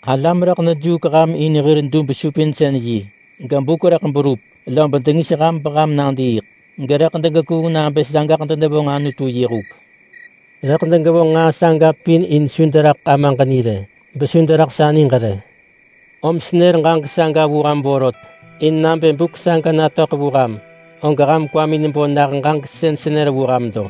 Alam rëḳ dejuuk ham in hir dub-supinsën-yi, gebuk rëḳ berup lob dengis ham beham nadiiḳ, gerëḳ degekuung nabë sagaḳ denevonġ Anutu yi huk. Rëḳ degevonġ nġaa saga pin in su deraḳ Amaġ ni rë, besu deraḳ sa niġ rë. Om senër ġaġek saga vu ham vorot, in nabë buk saga natöḳ vu ham, og ham kwamin bo nah ġaġek sën senër vu ham lo.”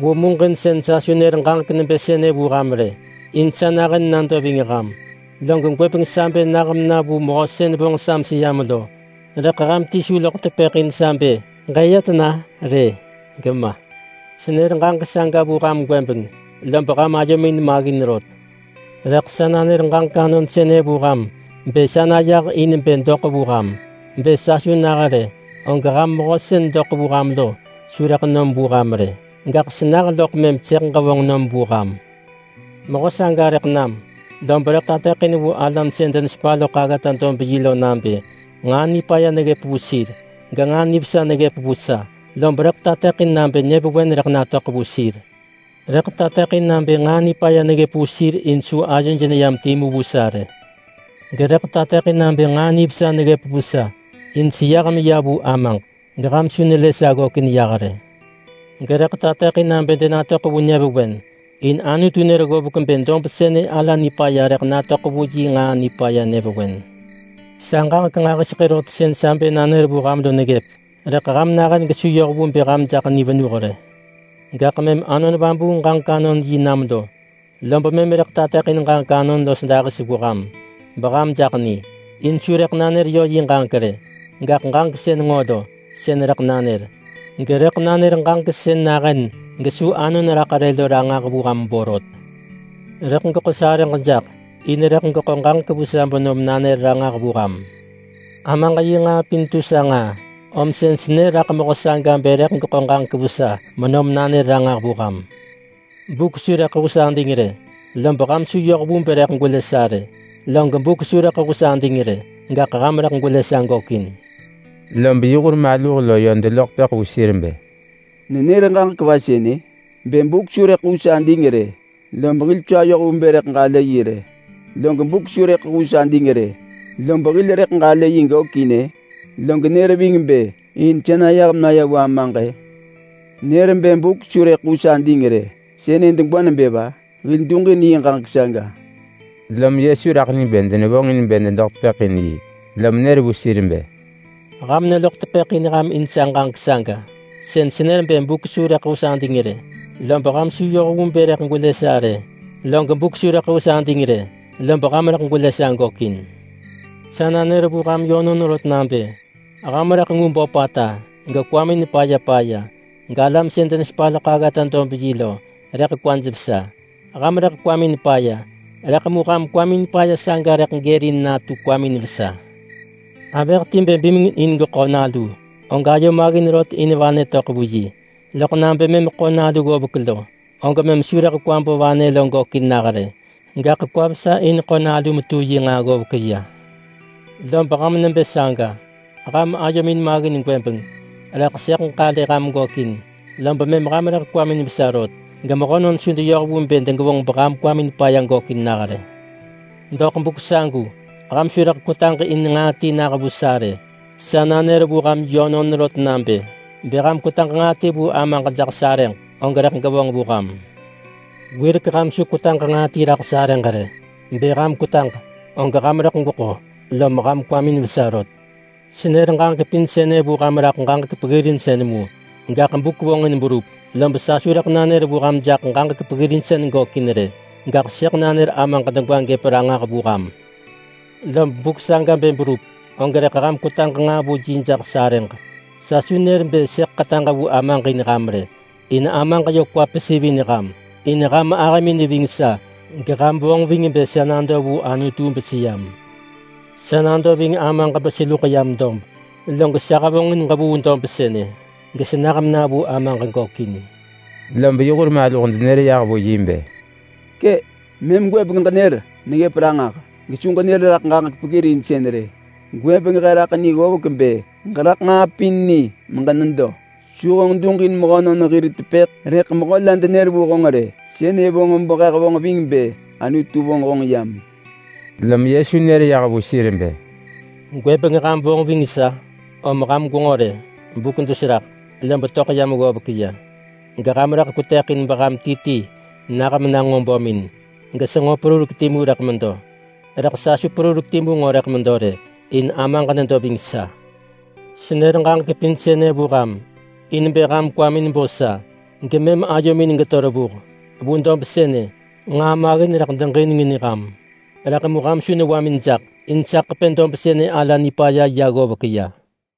“Vu muġinsën sa su nër ġaġek nebë sënë vu ham rë, in sa nahën nado ving ham. Log gwëbeng sa bë nah mena vu Mehö sën vonġ sa meseyam lo, rëḳ ham ti su loḳ tepëḳ in sa bë, ‘Ġëya tena?’ rë, gema. Senër ġaġek saga vu ham gwëbeng, lob ham ayomin maggin rot. Rëḳ sa nanër ġaġek anon sënë vu ham bë sa nayah in bë doḳ vu ham. Bë sa su nah rë, og ham Mehö sën doḳ vu ham lo su rëḳ nom vu ham rë. Gaḳ senah loḳ mëm sëḳ ġevonġ nom vu ham. Mehö saga rëḳ nam, lob rëḳ tateḳin vu alam sën denesepa loḳ aggata-dob-yi lo nabë nġaa nipaya neggëp vu sir, genġaa nivesa neggëp vu sa, lob rëḳ tateḳin nabë nyëvewen rëḳ natöḳ vu sir. Rëḳ tateḳin nabë nġaa nipaya neggëp vu sir in su ayoj neyam timu vu sa rë. Gerëḳ tateḳin nabë nġaa nivesa neggëp vu sa, in seyah meya vu Amaġ geham su nelë sa ggökin yah rë. Gerëḳ tateḳin nabë denatöḳ vu nyëvewen in Anutu nër ggovek bë dob sënë ala nipaya rëḳ natöḳ vu yi nġaa nipaya nyëvewen. Sa ġaġek nġahiseḳë rot sën sa bë nanër vu ham lo neggëp, rëḳ ham nahën gesu yoh vu bë ham jaḳ ni venuh rë. Gaḳ mëm Anon Vabuung ġaġek-anon-yi nam lo, lob mëm rëḳ tateḳin ġaġek anon los dahis vu ham beham jaḳ ni. In su rëḳ nanër yö yi ġaġek rë. Gaḳ ġaġek sën nġo lo, sën rëḳ nanër, gerëḳ nanër ġaġek sën nahën gesu anon raḳ rë lo ranġah vu ham borot. Rëḳ geḳo sarëġ jaḳ, in rëḳ geḳo ġaġek vu sa benom nanër ranġah vu ham. Amaġ yi nġaa pin tu sa nġaa, om sën senër raḳ Mehö saga bë rëḳ geḳo ġaġek vu sa menom nanër ranġah vu ham.” “Buk su rëḳ hus ading rë lob ham su yoh vu bë rëḳ gwelë sa rë, log buk su rëḳ hus ading rë gaḳ ham rëḳ gwelë sa gökin.” Lob yi hur maluh lo yö deloḳ tepëḳ vu sir bë, “Nenër ġaġek va sënë? Bë, ‘Buk su rëḳ hus ading rë lob hil su ayoh vu bë rëḳ ġalë yi rë, log buk su rëḳ hus ading rë lob hil rëḳ ġalë yi gökin-ë.’ Log nër ving bë neya vu Ama-ë? Nër bë buk su rëḳ hus ading rë sënë degwa nebë va? Hil duġin yi ġaġek saga!” Lom Yesu raḳ ni bë denevonġin bë dedoḳ tepëḳ in yi, lom nër vu sir bë, “Ham neloḳ tepëḳ in ham in sa ġaġek saga sën senër bë buk su rëḳ hus ading rë lob ham su yoh vu bë rëḳ gwelë sa rë, log buk su rëḳ hus ading rë lob ham rëḳ gwelë sa gökin. Sa nanër vu ham yönon rot nabë: Ham rëḳ ngu böpata, gekwamin paya paya, galam sën denesepa loḳ aggata-dob-yi lo rëḳ kwaj vesa. Ham rëḳ kwamin paya, rëḳ mu ham kwamin paya saga rëḳ gërin natu kwamin vesa. Avëh ti bë bimeng in geḳo nalu, og ayo maggin rot in vanë töḳ vu yi, loḳ nabë mëm geḳo nalu govek lo, og mëm su rëḳ kwa bo vanë lo gökin nah rë, gaḳ kwa vesa in ḳo nalu metu yi nġaa ggovek ya. Lob ham nebë saga. Ham ayomin maggin gwëbeng, rëḳ sëḳ ġalë ham gökin, lob mëm ham rëḳ kwamin vesa rot gemehönon su deyoh vu bë degevonġ beham kwamin paya gökin nah rë. Vu buk agu ham su rëḳ doḳ tepëḳ in nġaa ti nah vu sa rë. Sa nanër vu ham yönon rot nabë: Bë ham kwetaġ nġaa ti vu Amaġ jaḳ sarëġ, og rëḳ gevonġ vu ham. Wirek ham su kwetaġ nġaa ti raḳ sarëġ rë. Bë ham kwetaġ, og ham rëḳ gweḳo lom ham kwamin vesa rot.” “Senër ġaġek pin sënë vu ham raḳ ġaġek peggirinsën mu. Gaḳ buk vonġin berup, lob sa su rëḳ nanër vu ham jaḳ ġaġek peggirinsën gökin rë, gaḳ sëḳ nanër Amaġ degwa gëp ranġah vu ham. Lob buk saga bë berup, og rëḳ ham kwetaġ nġaa vu yi jaḳ sarëġ. Sa su nër bë sëḳ ḳetaġ vu Amaġ in ham rë, in Amaġ yö kwa pesivin ham, in ham ahëmin neving sa geham vonġ ving bë sa nado vu Anutu beseyam. Sa nado ving Amaġ beseluḳ yam dob. Log sa hevonġin ġevuu dob sënë, gesenah mena vu Amaġ gökin.” Lob yi hur maluh denër yah vu yi bë, “Kë! Mëm gwëbeng ġenër neggëp ranġah, gesu ġenër raḳ ġaġek peggirinsën rë. Gwëbeng he raḳ ni ggovek bë ġeraḳ nġaa pin ni meġenedo. Su honġ duġin mehönon hir tepëḳ rëḳ mehö la denër vu honġ rë. Sënë vonġ behe hevonġ ving bë Anutu vonġ honġ yam.” Lom Yesu nër yah vu sir bë, “Gwëbeng ham vonġ ving sa? Om ham gwenġo rë! Buk dus raḳ, lob töḳ yam ggovek ya, geham rëḳ kwetëḳin beham ti ti nah mena bömin, gesenġo perurek timu rëḳ medo. Rëḳ sa su perurek timu nġo rëḳ medo rë, in Amaġ nedo ving sa. Senër ġaġek pin sënë vu ham in bë ham kwamin bo sa gemëm ayomin geto revuh. Vu dob sënë nġaa maggin rëḳ deġinengin ham, rëḳ mu ham su newamin jaḳ, in sa ḳepë dob sënë ala nipaya ya ggovek ya.”